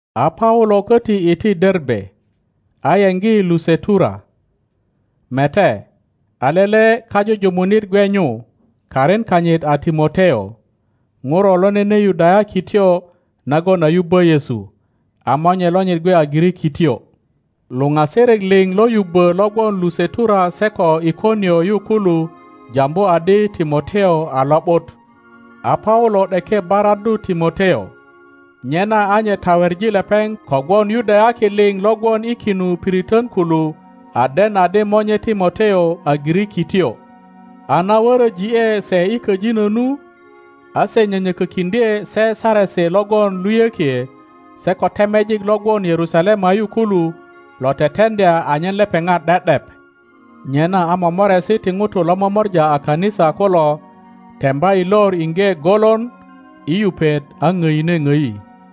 A Paulo köti iti Derbe, ayeŋgi Lusetura. Mete, a lele kajujumunit gwe nyu, karin kanyit a Timoteo, ŋuro lo nene Yudayakityo nagon a yubbö Yesu, a monye lonyit gwe a Girikityo. Luŋasirik liŋ lo yubbö lo gwon Lusetura se ko Ikonio yu kulu jambu adi Timoteo a lo ’but. A Paulo ’deke baraddu Timoteo, nyena a nye taweŋi lepeŋ kogwon Yudayaki liŋ lo gwon i kinu piritön kulu a den adi monye Timoteo a Girikityo. a na wöröji ’e se i köjinö nu, a se nyönyökökiŋdye se saresi logon luyökie se ko temejik lo gwon Yerusalema yu kulu lo teteŋdya anyen lepeŋat ’de ’dep. Nyena a momoresi ti ŋutu lo momora a kanisa kulo temba i lor iŋge golon i yupet a ŋdine ŋdi.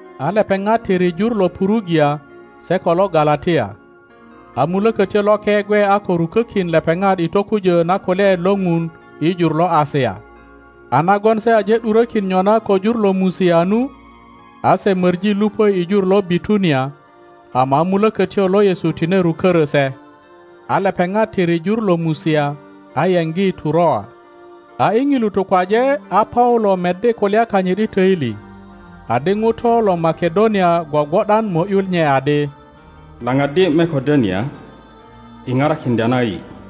A lepeŋat tiri jur lo Purugia se ko lo Galatia, a Mulökötyo Loke gwe a ko rukökin lepeŋat i tokujö na kulyaet lo ŋun i jur lo Asia. a nagon se aje ’durökin nyona ko jur lo Musia nu, a se möŋi luŋö i jur lo Bitunia, ama a Mulökötyo lo Yesu tine rukörö se. A lepeŋat tiri jur lo Musia a yeŋgi Turoa. A i ŋilu tukwaje a Paulo meddi kulya kanyit i töili, adi ŋuto lo Makedonia gwogwo ’dan mo ’yu nye adi, Laŋaddi Makedonia i parakiŋdya na yi.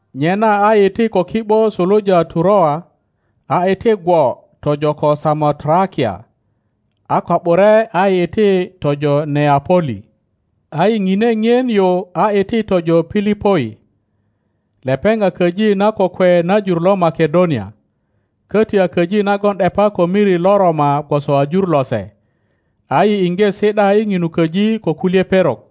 Nyena a yi iti ko ki ’bo suluja Turoa, a iti gwo tojo ko Samotrakia, a ko ’bure a yi iti tojo Neapoli. A yi ŋine ŋien yu a iti tojo Pilipoi. Lepeŋ a köji na kokwe na jur lo Makedonia, köti a köji nagon ’depa ko miri lo Roma gwoso a jur lose. A yi iŋge si ’da i ŋinu köji ko kulye perok.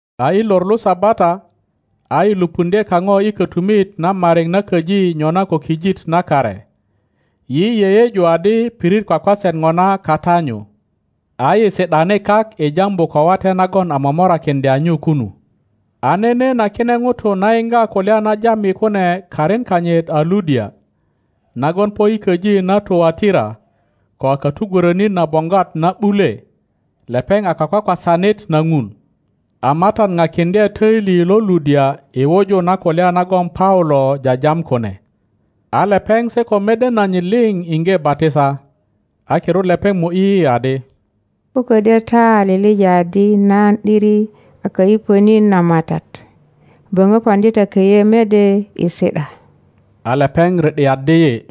A i lor lo Sabata, a yi lupundye kaŋo i kötumit na mariŋ na köji nyona ko kijit na kare. Yi yeyeju adi pirit kwakwaset ŋona kata nyu. A yi si ’dani kak i jambu ko wate nagon a momorakiŋdya nyu kunu. A nene na kine ŋutu na yiŋga kulya na jam yi kune karin kanyit a Ludia, nagon po i köji na Tuwatira ko a katugwörönit na boŋgwat na ’bule, lepeŋ a kakwakwasanit na Ŋun. A Matat pakiŋdye töili lo Ludia i wuju na kulya nagon Paulo jajam kune. A lepeŋ se ko mede nanyit liŋ iŋge batisa, a kirut lepeŋ mo ’yi yi adi, Ko ködyö ta a liŋ adi nan ’diri a kayupönit na Matat, böŋö poŋdi ta köyö mede i si ’da. A lepeŋ ri ’diaddi yi.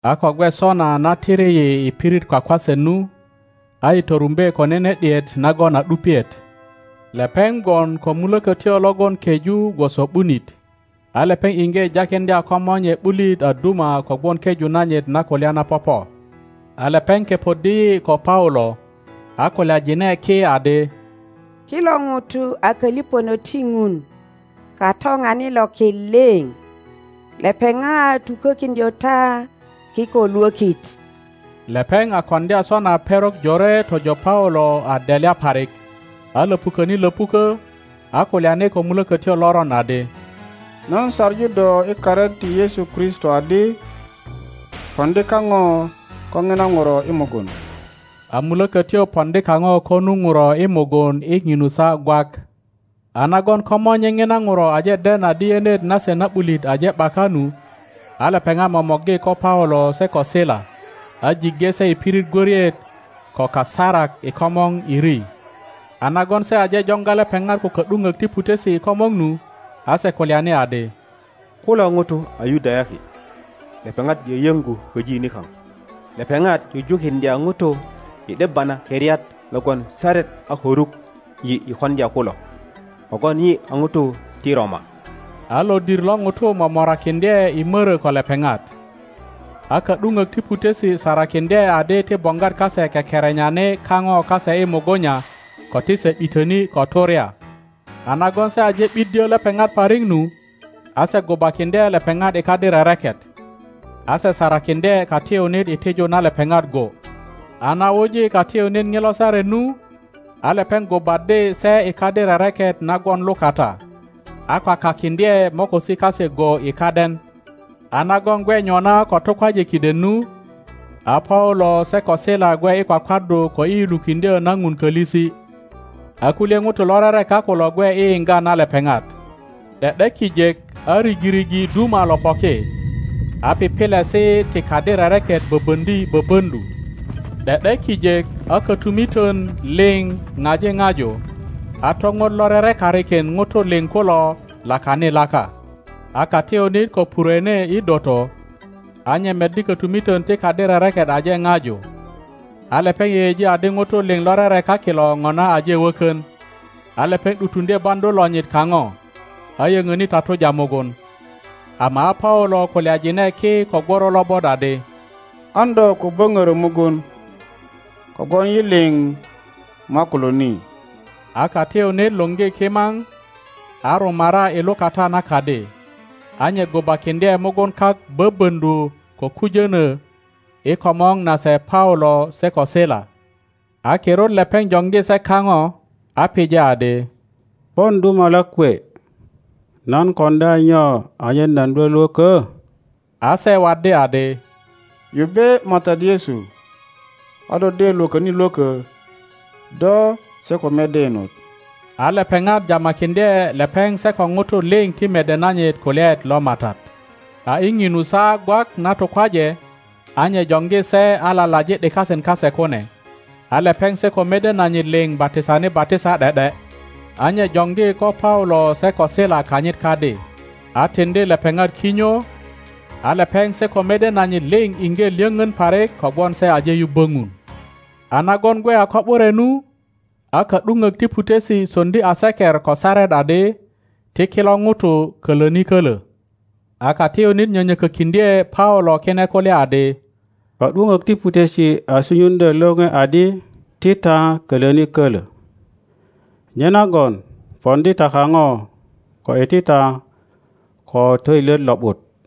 A ko gwe sona na tiri yi i pirit kwakwaset nu, a yi torumbe ko nene ’diet nagon a ’dupiet. Lepeŋ gwon ko mulökötyo logon keju gwoso ’bunit, a lepeŋ iŋge jakiŋdya komonye ’bulit a duma kogwon keju nanyit na kulya na popo. A lepeŋ kepoddi yi ko Paulo, a kulyajine ki adi, Kilo ŋutu a köliŋönök ti Ŋun Katoŋanit lo ki liŋ, lepeŋat tukökiŋdyö ta kiko lwökit. Lepeŋ a koŋdya sona perok jore tojo Paulo a delya parik, a löpu köni lö puök, a kulyani ko mulökötyo loron adi, Nan saŋu do i karin ti Yesu Kristo adi, poŋdi kaŋo ko ŋina ŋuro i mugun. A mulökötyo poŋdi kaŋo ko nu ŋuro i mugun i ŋinu saa gwak. A nagon komonye ŋina ŋuro aje den adi yenet nase na ’bulit aje ’baka nu, a lepeŋat momorgi ko Paulo se ko Sila a jiŋge se i pirit gwöriet ko kasarak i komor i ri; a nagon se aje joŋga lepeŋat ko ka ’duŋök ti putesi i komor nu, a se kulyani adi, Kulo ŋutu a Yudayaki; lepeŋat yöyöŋgu köji nikaŋ. Lepeŋat jujukiŋdya ŋutu i ’debba na keriat logon saret a ko ruk yi i koŋdya kulo, kogwon yi a ŋutu ti Roma. A lodir lo ŋutu momorakiŋdye i mörö ko lepeŋat. A ka ’duŋök ti putesi sarakiŋdye adi ti boŋgwat kase kekerenyani kaŋo kase i mugunya ko ti se ’bitöni ko turya. a nagon se aje ’biddyö lepeŋat parik nu, a se gubakiŋdye lepeŋat i kadi rereket, a se sarakiŋdye katiyunit i tiju na lepeŋat go, A na wuji katiyunit ŋilo saret nu, a lepeŋ gubaddi se i kadi rereket na gwon lukata, a kwakakiŋdye mokosi kase go i kaden. A nagon gwe nyona ko tukwaje kiden nu, a Paulo se ko Sila gwe i kwakwaddu ko i yulukiŋdyö na Ŋun kölisi, a kulye ŋutu lo rereka kulo gwe i yiŋga na lepeŋat. ’De ’de kijek a rigirigi duma lo poki, a pipilesi ti kadi rereket böböŋdi böböŋdu. ’De ’de kijek a kötumitön liŋ ŋaji ŋaju, a toŋot lo rerekarikin ŋutu liŋ kulo lakani laka. A katiyunit ko purwene i doto, a nye meddi kötumitön ti kadi rereket aje ŋaju, a lepeŋ yeyeji adi ŋutu liŋ lo rereka kilo ŋona aje wökön, a lepeŋ ’dutuŋdye baŋdu lonyit kaŋo, a yönöni tatuja mugun. Ama a Paulo kulyajine ki ko gworo lobot adi, An do ko böŋörö mugun, kogwon yi liŋ makulo ni. A katiyunit luŋgi kimaŋ, a rumara i lukata na kadi, a nye gubakindye mugun kak böböŋdu ko kujönö i komor nase Paulo se ko Sila. a kirut lepeŋ joŋgi se kaŋo, a pije adi, Pon dumalak kwe, nan koŋdya nyo anyen nan lwölwökö? A se waddi adi, Yubbe Matat Yesu, a do de lwököni lwökö, do se ko mede inot. A lepeŋat jamakiŋdye lepeŋ se ko ŋutu liŋ ti mede nanyit kulyaet lo Matat. A i ŋinu saa gwak na tukwaje, a nye joŋgi se a lalaji ’dikasin kase kune, a lepeŋ se ko mede nanyit liŋ batisani batisa ’de ’de. a nye joŋgi ko Paulo se ko Sila kanyit kadi, a tiŋdi lepeŋat kinyo, a lepeŋ se ko mede nanyit liŋ iŋge lyöŋön parik kogwon se aje yubbo Ŋun. A nagon gwe a ko ’bure nu, a ka ’duŋök ti putesi soŋdi aseker ko saret adi, Ti kilo ŋutu koloni kölö. A katiyunit nyönyökökiŋdye Paulo kine kulya adi, Ka ’duŋök ti putesi a sunyuŋdyö lore adi ti ta kölöni kölö. Nyenagon poŋdi ta kaŋo ko iti ta ko töilyet lo ’but.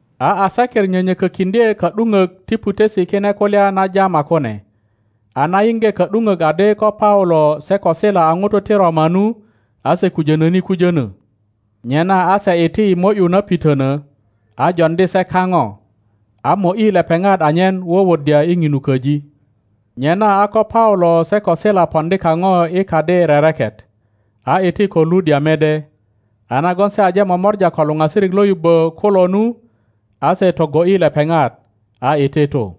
A aseker nyönyökökiŋdye ka ’duŋök ti putesi kine kulya na jama kune, a na yiŋge ka ’duŋök adi ko Paulo se ko Sila a ŋutu ti Roma nu, a se kujönöni kujönö. Nyena a se iti i mo ’yu na pitönö, a joŋdi se kaŋo, a mo ’yi lepeŋat anyen wuwuddya i ŋinu köji. Nyena a ko Paulo se ko Sila poŋdi kaŋo i kadi rereket, a iti ko Ludia mede, a nagon se aje momora ko luŋasirik lo yubbo kulo nu, a se togo ’yi lepeŋat, a iti tu.